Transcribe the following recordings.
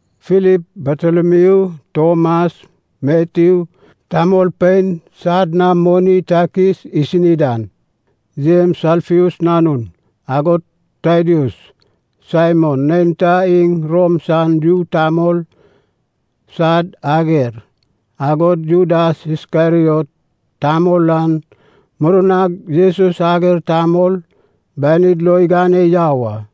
Filip, Bartolomiu, Tomas, Matyu tamolpein sad na moni takis isi dan, Jems Alfeus nanun, agod Tadaeus. Saimon neinta iŋ Rom san yu tamol sad ager, agod Judas Iskeriot tamol an murnag Jesus ager tamol banid lo igane yau a.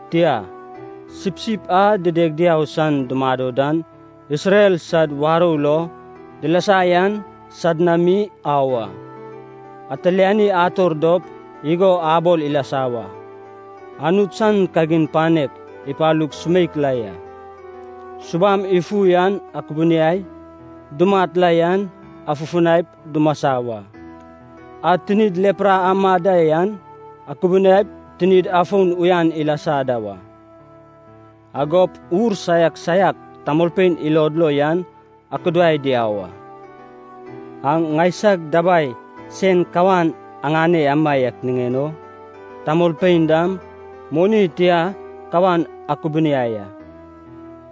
Tia, sipsip a dideg diau san dumado dan Isrel sad warou lo dilasa yan sad na mi au a. Atiliani ator dop igo abol ilasa wa, ‘Anut san kagin panek ipalug sumeik la ya.’ Subam ifu an akubuniai, dumat la yan afufunaip dumasa wa. A tinid lepra amad da yan akubuniaip tinid afon uyan ilasa da wa. Agop ur saiak saiak tamolpein ilod lo yan akudai diau a. Aŋ ŋaisag dabai sen kawan aŋane amaiak niŋen o, tamolpein dam moni tia kawan akubuniai a.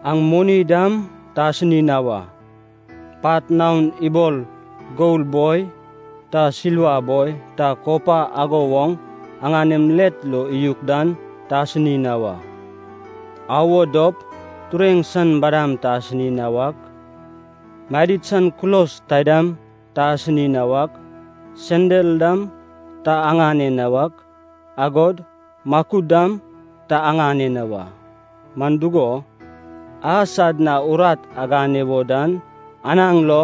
Aŋ moni dam ta asini na wa. Pat naon ibol gol boi ta silva boi ta kopa ago woŋ aŋanem let lo iyuk dan ta asini na wa. Au wo dop tureŋ san badam ta asini na wak, madid san kulos taidam ta asini na wak, sendal dam ta aŋane na wak, agod makud dam ta aŋane na wa. Man dugo, a sad na urat agane wo dan anaŋ lo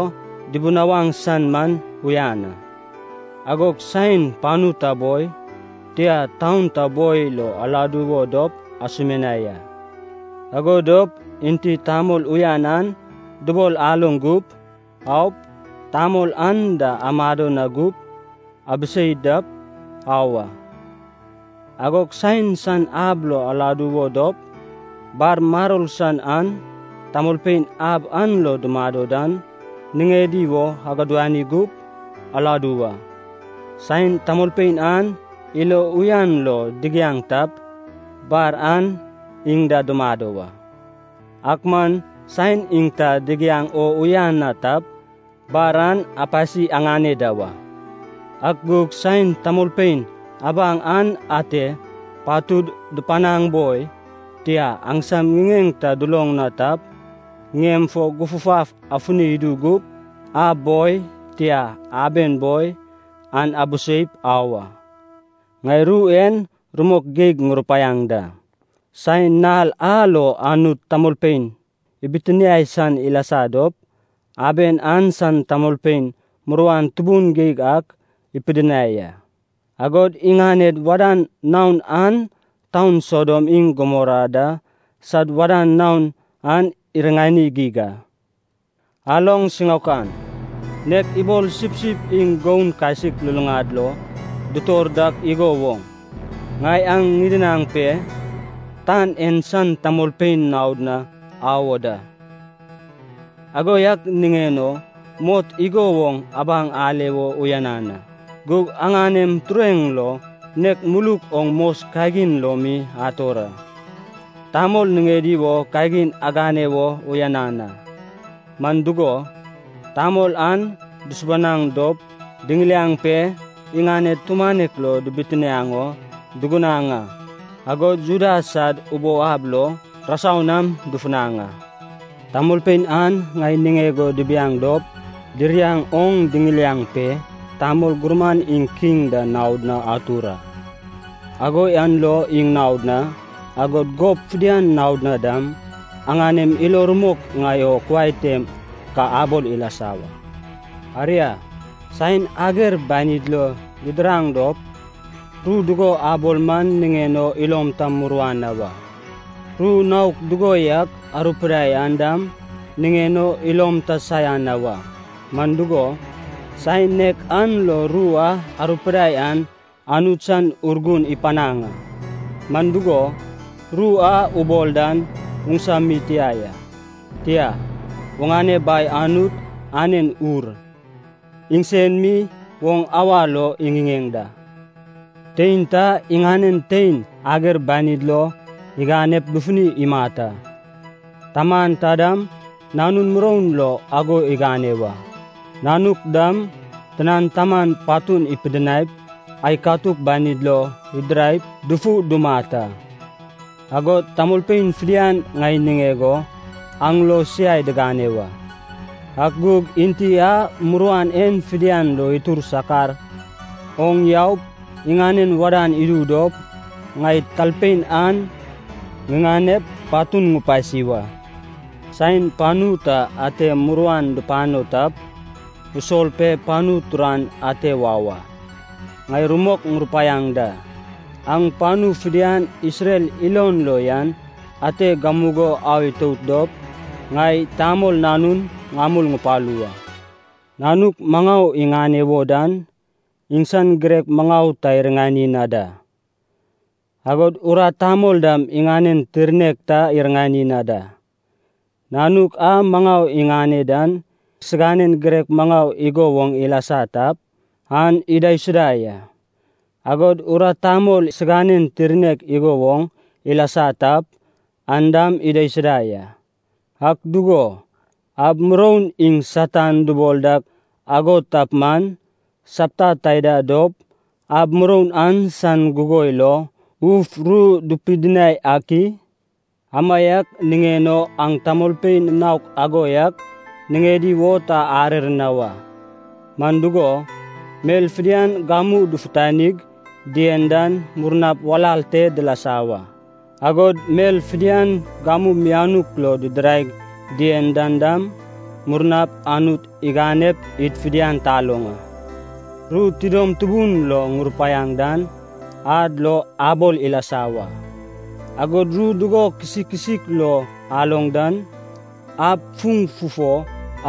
dibinawaŋ san man uyan a. “Agog saen panu ta boi, tia taun ta boi lo aladu wo dop asumianai a. Ago dop enti tamol uyan an dubol aloŋ gup, aup, tamol an da amado na gup, abisei dap, au a. Agog saen san ab lo aladu wo dop, bar maror san an tamolpein ab an lo dumado dan niŋedi wo agudani gup, aladu wa. Saen tamolpein an ilo uyan lo digiaŋ tap, bar an iŋ da dumado wa. Ak man saen iŋ ta digiaŋ o uyan na tap, bar an apasi aŋane da wa. Ak gug saen tamolpein abaŋ an ate patud dupanaŋ boi, tia, aŋsam ŋiŋeŋ ta duloŋ na tap, ŋiem fo gufgaf afuni idu gup, ab boi, tia, aben boi, an abiseip au a. Ŋai ru en rumok geig ŋurupaiaŋ da, saen nal a lo Anut tamolpein ibitinae san ilasa dop, aben an san tamolpein muruan tubun geig ak ipidinai a. Agod iŋaned wadan naon an taun Sodom iŋ Gomora da sad wadan naon an iriŋani geig a. Aloŋ siŋaokan, nek ibol sipsip iŋ goun kasik luluŋad lo dutor dak igo woŋ, ŋai aŋ ŋidinaŋ pe tan en san tamolpein naod na au o da. Ago yak niŋen o mot igo woŋ abaŋ ale wo uyanan a, gug aŋanem tureŋ lo nek muluk oŋ mos kagin lo mi ator a. “Tamol niŋedi wo kagin agane wo uyanan a, man dugo, tamol an dusubanaŋ dop diŋiliaŋ pe iŋaned tumanek lo dibitiniaŋ o dugunaŋ a, agod Juda sad ubou ab lo rasau nam dufunaŋ a. Tamolpein an ŋai niŋeg o dibiaŋ dop diriaŋ oŋ diŋiliaŋ pe tamol gurman iŋ kiŋ da naod na atur a. Ago yan lo iŋ naod na, agod gob fidian naod na dam, aŋanem ilo rumok ŋai o kuai tem ka abol ilasa wa. Aria, saen ager banid lo didiraŋ dop, ru dugo abol man niŋen o ilom ta muruan na wa, ru naok dugo yak arupidai an dam niŋen o ilom ta saian na wa. Man dugo, saen nek an lo ru a arupidai an Anut san Urgun ipanaŋ a. Man dugo, ru a ubol dan oŋsa mi tia ya. Tia, oŋane Bai Anut anen Ur, iŋsen mi oŋ awa lo iŋiŋeŋ da. Tein ta iŋanen tein ager banid lo iganep dufuni imat a. Taman ta dam nanun muroun lo ago igane wa. Nanuk dam tinan taman patun ipidinaip ai katuk banid lo idiraip dufu dumat a. Agod tamolpein fidian ŋai niŋeg o aŋ lo siai digane wa. Ak gug enti a muruan en fidian lo itur sakar oŋ yaup iŋanen wadan idu dop, ŋai talpein an ŋiŋanep patun ŋupasi wa. Saen panu ta ante muruan dupano tap, usol pe panu turan ate wau a. Ŋai rumok ŋurupaiaŋ da, aŋ panu fidian Isrel ilon lo yan ate gamugo au itout dop, ŋai, Tamol Nanun, ŋamul ŋupalu wa. “Nanuk maŋau iŋane wo dan, iŋsan girek maŋau ta iriŋani na da. Agod urat tamol dam iŋanen tirnek ta iriŋani na da. Nanuk a maŋau iŋane dan siganen girek maŋau igo woŋ ilasa tap, an idaisuda ya. Agod urat tamol siganen tirnek igo woŋ ilasa tap, an dam idaisuda ya. Ak dugo, ab muroun iŋ Satan dubol dak ago tap man, sapta taida dop ab muroun an san gugoi lo uf ru dupidinai ak i? “Amaiak niŋen o aŋ tamolpein naok ago yak niŋedi wo ta arer na wa. Man dugo, mel fidian gamu dufutanig dien dan murnap walal te dilasa wa, agod mel fidian gamu mianuk lo didiraig dien dan dam, murnap Anut iganep id fidian taloŋ a. Ru tidom tubun lo ŋurupaiaŋ dan, ad lo abol ilasa wa. Agod ru dugo kisikisik lo aloŋ dan, ab fuŋ fufo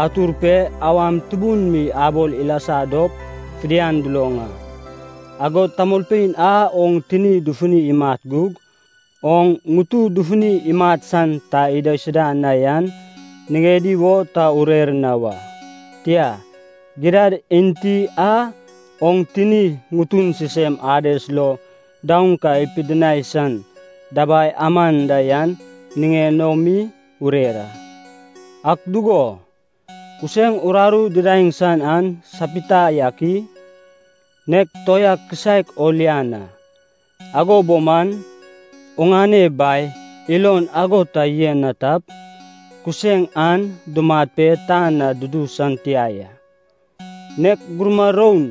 atur pe awam tubun mi abol ilasa dop fidian duloŋ a. Agod tamolpein a oŋ tini dufuni imat gug, oŋ ŋutu dufuni imat san ta idaisuda na yan niŋedi wo ta urer na wa. Tia, gidad enti a oŋ tini ŋutu sisem Ades lo daoŋ ka ipidinai san dabai aman da yan niŋen o mi urer a. Ak dugo, kuseŋ uraru didaeŋ san an sapita yak i? Nek toea kisaek o lian a. Ago bo man, oŋane Bai ilon ago ta yen na tap, kuseŋ an dumat pe tan na dudu san tia ya. Nek gurma roun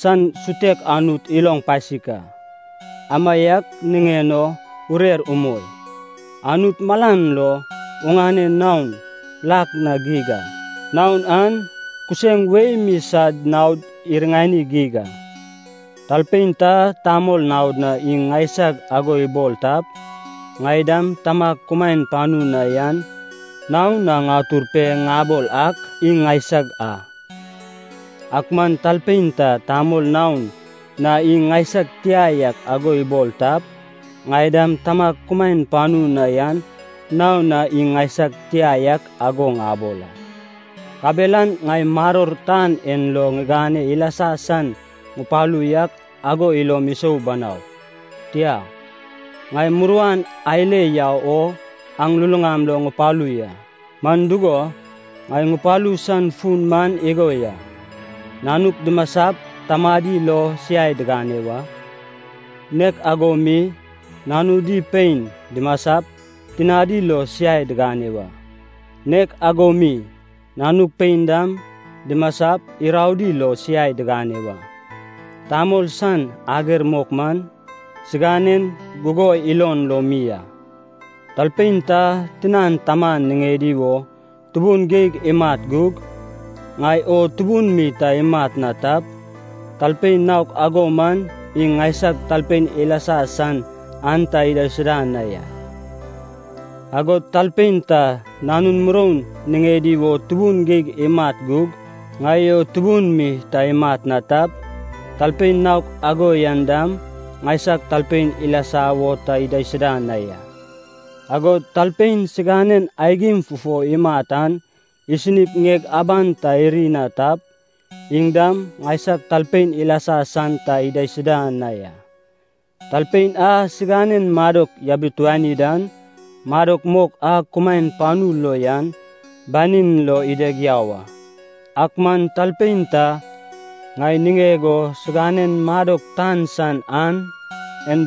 san sutek Anut iloŋ pasik a. Amaiak niŋen o urer umoi. Anut malan lo oŋane naon lak na geig a, naon an kuseŋ wei mi sad naod iriŋani geig a. “Talpein ta tamol naod na iŋ ŋaisag ago ibol tap, ŋai dam Tamag kumaen panu na yan naon na ŋatur pe ŋabol ak iŋ ŋaisag a. Ak man talpein ta tamol naod na iŋ ŋaisag tia yak ago ibol tap, ŋai dam Tamag kumaen panu na yan naon na iŋ ŋaisag tia yak ago ŋabol a. Kabelan ŋai maror tan en lo ŋigane ilasa san ŋupalu yak ago ilom isou banau. Tia, ŋai muruan ale yau o aŋ luluŋam lo ŋupalu ya. Man dugo, ŋai ŋupalu san fun man igo ya, ‘nanuk dimasap tamadi lo siai digane wa, nek ago mi nanudi pein dimasap tinadi lo siai digane wa. Nek ago mi, nanuk pein dam dimasap iraodi lo siai digane wa. Tamol san ager mok man, siganen gugoi ilon lo mi a.’ Talpein ta tinan taman niŋedi wo tubun geig imat gug, ŋai o tubun mi ta imat na tap, talpein naok ago man iŋ ŋaisag talpein ilasa san an ta idaisuda na ya. Agod talpein ta nanun muroun niŋedi wo tubun geig imat gug, ŋai o tubun mi ta imat na tap, talpein naok ago yan dam ŋaisag talpein ilasa wo ta idaisuda na ya. Agod talpein siganen aigim fufo imat an isinip ŋieg aban ta iri na tap, iŋ dam ŋaisag talpein ilasa san ta idaisuda na ya. Talpein a siganen madok yabituani dan, madok mok a kumaen panu lo yan banin lo ideg yau a. Ak man talpein ta ŋai niŋeg o siganen madok tan san an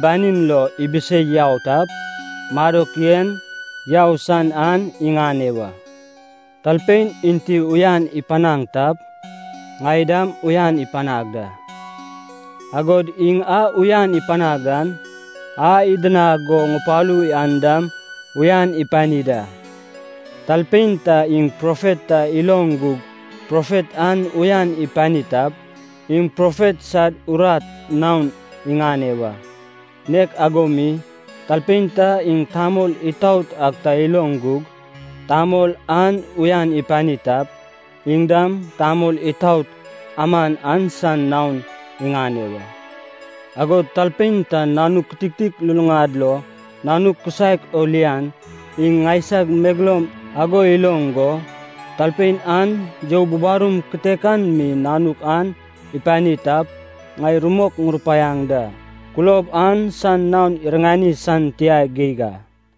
banin lo ibisei yau tap, madok yen yau san an iŋane wa. “Talpein enti uyan ipanaŋ tap, ŋai dam uyan ipanag da. Agod iŋ a uyan ipanag dan, a idinag go ŋupalu yan dam uyan ipani da. Talpein ta iŋ profet ta iloŋ gug profet an uyan ipani tap, iŋ profet sad urat naon iŋane wa. Nek ago mi, talpein ta iŋ tamol itaot ak ta iloŋ gug, tamol an uyan ipani tap, iŋ dam tamol itaot aman an san naon iŋane wa. Agod talpein ta nanuk kititik luluŋad lo nanuk kisaek o lian, iŋ ŋaisag megeloum ago iloŋ go, talpein an you bubarum kitek an mi nanuk an ipani tap, ŋai rumok ŋurupaiaŋ da, kulob an san naon iriŋani san tia geig a.”